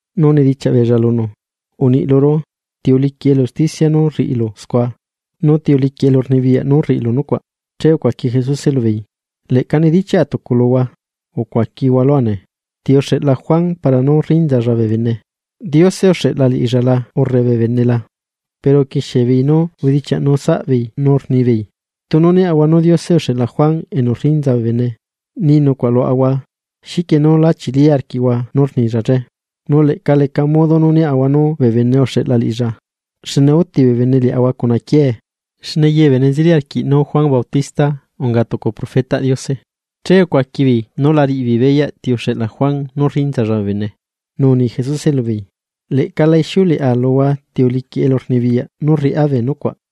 nu unidichiaꞌ beella lunu: ―Uniꞌ luru, ¿ti uliquiꞌ elu usticia nú rriꞌilu scua? Nu ¿ti uliquiꞌ elurnibiyaꞌ nú rriꞌilu nucuaꞌ? Che ucuaqui Jesuse lubeei: ―Leꞌca nidichiaꞌa tucu luhua. Ucuaquihua lua nee: ¿Ti uxeꞌla Juan para nú rinzalla bee bene? ¿Diose uxeꞌla liꞌilla la urre bee bene la? Pero uquixie beei nú ubedichiaꞌnu saꞌbeei nu rnibeei: ―Tunu niaꞌahua nú Diose uxeꞌla Juan Bautista, che ni nucuaꞌ luaꞌahua: “¿Xiquie nú la chili arquiꞌhua nú rnilla che?” Nu leꞌca leca modo nú niaꞌahua nú bee bene uxeꞌla liꞌilla, xne úti bee bene liaꞌahua cuna quiee, xne ye bee bene nzeli arquiꞌ nú Juan Bautista unga tucu profetaꞌ Diose. Che ucuaqui beei nú la riꞌi beei beyaꞌ ti uxeꞌla Juan nú rrinzalla bee bene. Nu uni Jesuse lubeei: ―Leꞌca la ixiuleꞌa luhua ti uliquiꞌ elurnibiyaꞌ nú rriꞌá bee nucuaꞌ.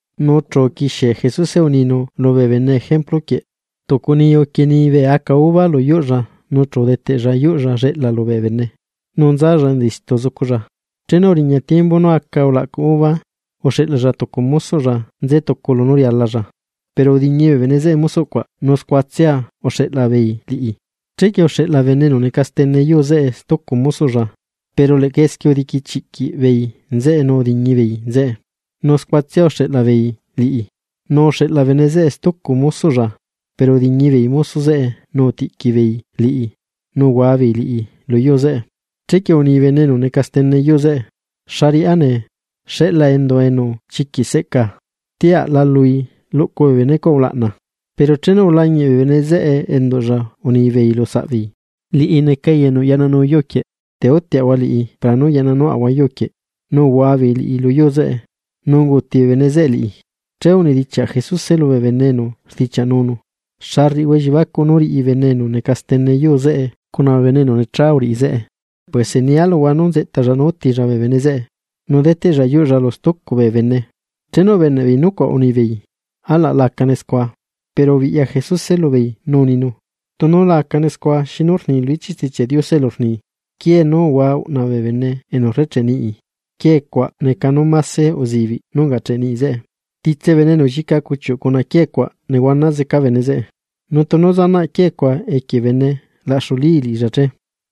Nu chu uquixie Jesuse uninu lubee bene ejemplu quieꞌ: ―Tucu niyu uquienii bee aca uva lu yuꞌlla nu chu udeteꞌlla yuꞌlla lleꞌla lubee bene, nu nzalla enza istu zuculla. Chenu uriña tiembu nú aca ulaꞌcu uva, uxeꞌlalla tucu mosoꞌlla nzetucu lunú rialalla. Pero udiñi bee bene zeꞌe mosoꞌ cuaꞌ nu scuatsia uxeꞌla beei liꞌi. Chequie uxeꞌla bene enu neca stene yuu zeꞌe stucu mosoꞌlla, pero leꞌca esquie udiquichiꞌquiꞌ beei nzeꞌe nu udiñi beei nzeꞌe, nu scuatsia uxeꞌla beei liꞌi. Nu uxeꞌla bene zeꞌe stucu mosoꞌlla, pero udiñi beei mosoꞌ zeꞌe nu utiꞌqui beei liꞌi, nu uhua beei liꞌi lu yuu zeꞌe. ’Chequie uni bene enu neca stene yuu zeꞌe: “¿Xa riꞌá nee? Xeꞌla endua enu chiquiꞌ seꞌca, tia aꞌla liꞌi luꞌcu bee bene cuaꞌ ulaꞌna.” Pero chenu ulañiꞌ bee bene zeꞌe enduꞌlla unibeei lu saꞌ beei: “Liꞌi neca enu yaꞌnanu yuu quieꞌ, te útiaꞌahua liꞌi para nú yaꞌnanuaꞌahua yuu quieꞌ.” Nu uhua beei liꞌi lu yuu zeꞌe, nu unguti bee bene zeꞌe liꞌi. Che unidichiaꞌ Jesuse lubee bene enu rdichiaꞌnunu: ―¿Xa rriꞌihua elliebacuꞌ nú riꞌi bene enu neca stene yuu zeꞌe cuna bee bene zeꞌe? Puese nia luhua nú nzeꞌtalla nu útilla bee bene zeꞌe, nu deteꞌlla yuꞌlla lu stucu bee bene. Chenu ubeneꞌ beei nucuaꞌ, unibeei: ―¡Alaꞌ la acane scua! Pero ubiꞌya Jesuse lubeei nu uninu: ―Tunu la acane scua, ¿xinu rni lu ichiꞌ Stichiaꞌ Diose elu rni?: Quiee nú uhua uꞌna bee bene enu rrecheꞌe niꞌi, quiee cuaꞌ neca nú máse uzibiꞌ ungacheꞌ niꞌi zeꞌe. Titse bene enu llica cuchiuꞌ cuna quiee cuaꞌ nehuana zeca bene zeꞌe, nu tunu zanaꞌ quiee cuaꞌ equie bene, laꞌxulíi liꞌilla che.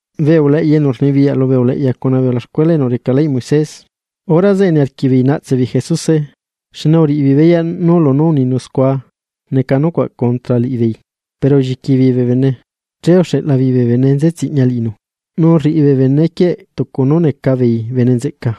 Bee uleꞌya enu rnibiyaꞌ lubee uleꞌya cuna bee ulaxcuela enu reca leyꞌ Moisés. Hora zeꞌe niarquiꞌ beei naꞌtse beei Jesuse, xne uriꞌi beei beyaꞌ nú lunú uninu scua neca nucuaꞌ contra liꞌibeei, pero ulliqui beei bee bene. Che uxeꞌla beei bee bene nze tsiꞌña liꞌinu, nu rriꞌi bee bene quieꞌ tucu nú neca beei bene nzeꞌca,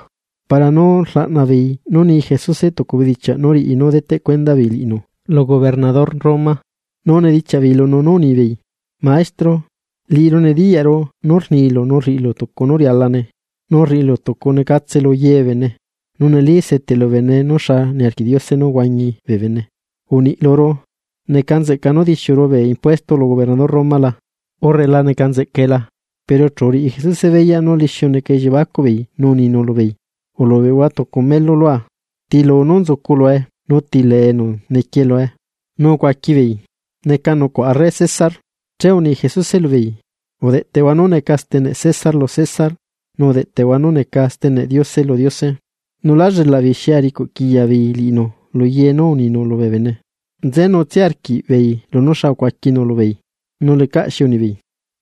para nú rlaꞌna beei nú ni Jesuse tucu bedichiaꞌ nú riꞌi nú deteꞌ cuenda beei liꞌinu lu gobernador Roma. Nu unidichiaꞌ beei lunu, nú unibeei: ―Maestro, liꞌiru nediyaꞌru nú rnilu nu rriꞌilu tucu nú rialane, nu rriꞌilu tucunecatse lu ye bee bene, nu neli seteꞌlu bee bene nú xa niarquiꞌ Diose nú huañi bee bene. Uniꞌ luru: ¿Neca nzeꞌca nú dixiuru bee impuesto lu gobernador Roma la?, ¿urre la neca nzeꞌcae la? Pero chu uriꞌi Jesuse beyaꞌ nú lixiu neca elliebacuꞌ beei, nu uninu lubeei: ―Ulubeꞌhua tucu melu lua. ¿Tiluu nú nzucu lue, nu ti nombreꞌ nequie lue? Nu ucuaqui beei: ―Neca nucuaꞌ arre César. Che uni Jesuse lubeei: ―Udeꞌteꞌhua nú neca steneꞌ César lu César, nu udeꞌteꞌhua nú neca steneꞌ Diose lu Diose. Nu lá llelaꞌ beei xi aricuꞌquiya beei liꞌinu lu ye nú uninu lubee bene. Nzenutsia arquiꞌbeei lunú xa ucuaquinu lubeei, nu lecaꞌ xi unibeei.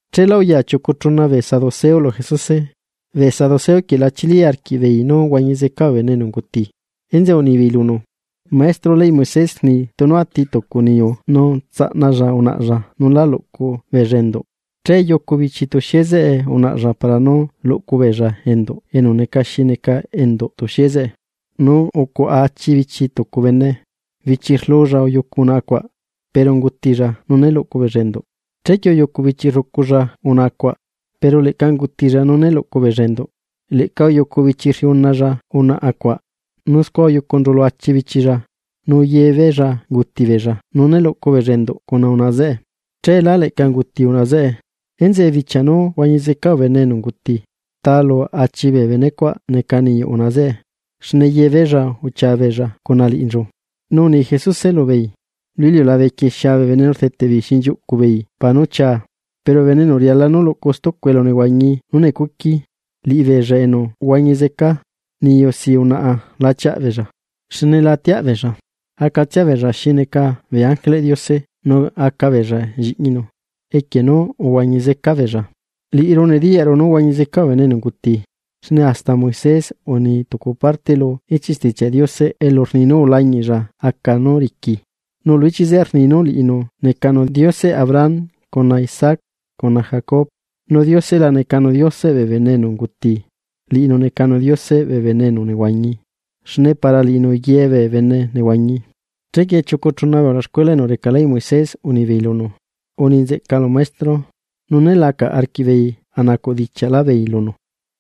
Cheela uya chiucu chuna bee Saduseo lu Jesuse. Bee saduceo quieꞌ la chili arquiꞌbeei nú huañi zeca bee bene enu unguti. Enzeꞌe unibeei lunu: ―Maestro, leyꞌ Moisés rni tunu ati tucu niyu nu tsaꞌnalla unaꞌalla nu lá luꞌcu beei enduꞌ, che yucu bichi tuxie zeꞌe unaꞌalla para nú luꞌcu beella enduꞌ enu neca xi neca enduꞌ tuxie zeꞌe. Nu ucuaꞌa achi bichi tucu bene, bichi rluu beei uyucu unaꞌa, pero ungutilla nu né luꞌcu beella enduꞌ. Chequie uyucu bichi rrucu beei unaꞌa zeꞌe, pero leꞌca ungutilla nu né luꞌcu beella enduꞌ. Leꞌca uyucu bichi rriuna beei unaꞌa zeꞌe, nu scua uyucunchu lu achi bichi beei, nu ye beei unguti beei nu né luꞌcu beei enduꞌ cuna unaꞌa zeꞌe. Cheela, leꞌca unguti unaꞌa zeꞌe. Enzeꞌe bichia nú huañi zeca bee bene enu unguti, ¿ta lu achi bee benecuaꞌ neca niyuꞌ unaꞌa zeꞌe, xne ye beei uchia beei cuna liꞌinchu? Nu uni Jesuse lubeei: ―Lu iliulabe quieꞌ xia bee bene nu rdeteꞌ beei xinchiuꞌcu beei para nú chia. Pero bee bene enu riala nú luꞌcu stucu elu nehuañi nú necuqui, liꞌibeella enu huañi zeca, niyu si unaꞌa la chiaꞌ beella. Xne la atiaꞌ beella, acatsia beella xi neca bee ángeleꞌ Diose nu aca beella lliꞌñinu, equie nú uhuañi zeca beella. Liꞌiru nediyaꞌru nú huañi zeca bee bene enu unguti, xne hasta Moisés uni tucu parte lu ichiꞌ Stichiaꞌ Diose elu rni nú ulañiꞌlla aca nú riqui. Nu lu ichiꞌ zeꞌe rni nú liꞌinu necanu Dioseꞌ Abraham cuna Isaac, cuna Jacob. ¡Nu Diose la necanu Dioseꞌ bee bene enu unguti, liꞌinu necanu Dioseꞌ bee bene enu nehuañi, xne para liꞌinu ye bee bene nehuañi! Chequie chiucu chuna bee ulaxcuela enu reca leyꞌ Moisés unibeei lunu: ―Uni nzeꞌcalu Maestro. Nu né lacaꞌ arquiꞌbeei a nacuꞌ dichiaꞌlá beei lunu.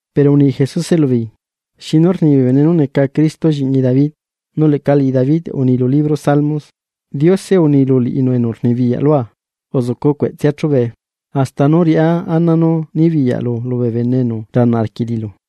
Pero uni Jesuse lubeei: ―¿Xinu rni bee bene nú neca Cristo lliꞌñi David? Nu leꞌca liꞌi David uni lu libro Salmos: Diose uni lu liꞌinu enu rnibiyaꞌ lua: “Uzucu cueꞌtsea chubee, hasta nú riꞌá ana nú nibiyaꞌlu lubee bene enu rle lulu.”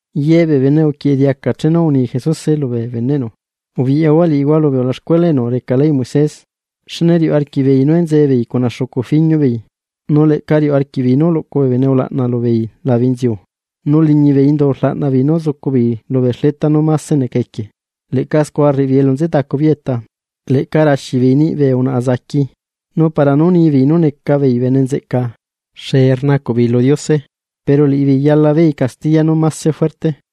Ye bee bene uquieꞌe diaca chenu uni Jesuse lubee beneꞌnu: ―Ubiꞌyahua liꞌihua lubee ulaxcuela enu reca leyꞌ Moisés, xne riuꞌ arquiꞌbeei nú enzee beei cuna xucu fiñu beei, nu leꞌca riuꞌ arquiꞌbeei nú luꞌcu bee bene ulaꞌna lubeei labe inziu. Nu liñi bee indu rlaꞌna beei nú zucu beei lubee xleta nú máse neca equie, leꞌca scua rriꞌi beei elu nze tacu beei eta. Leꞌca raxi beei niꞌi bee unaꞌa enu unguti niyuꞌ, nu para nú ni bee bene nú neca beei bene nzeꞌca, xee rnacuꞌ beei lu Diose. Pero liꞌibeei yala beei castiya nú mase fuerte.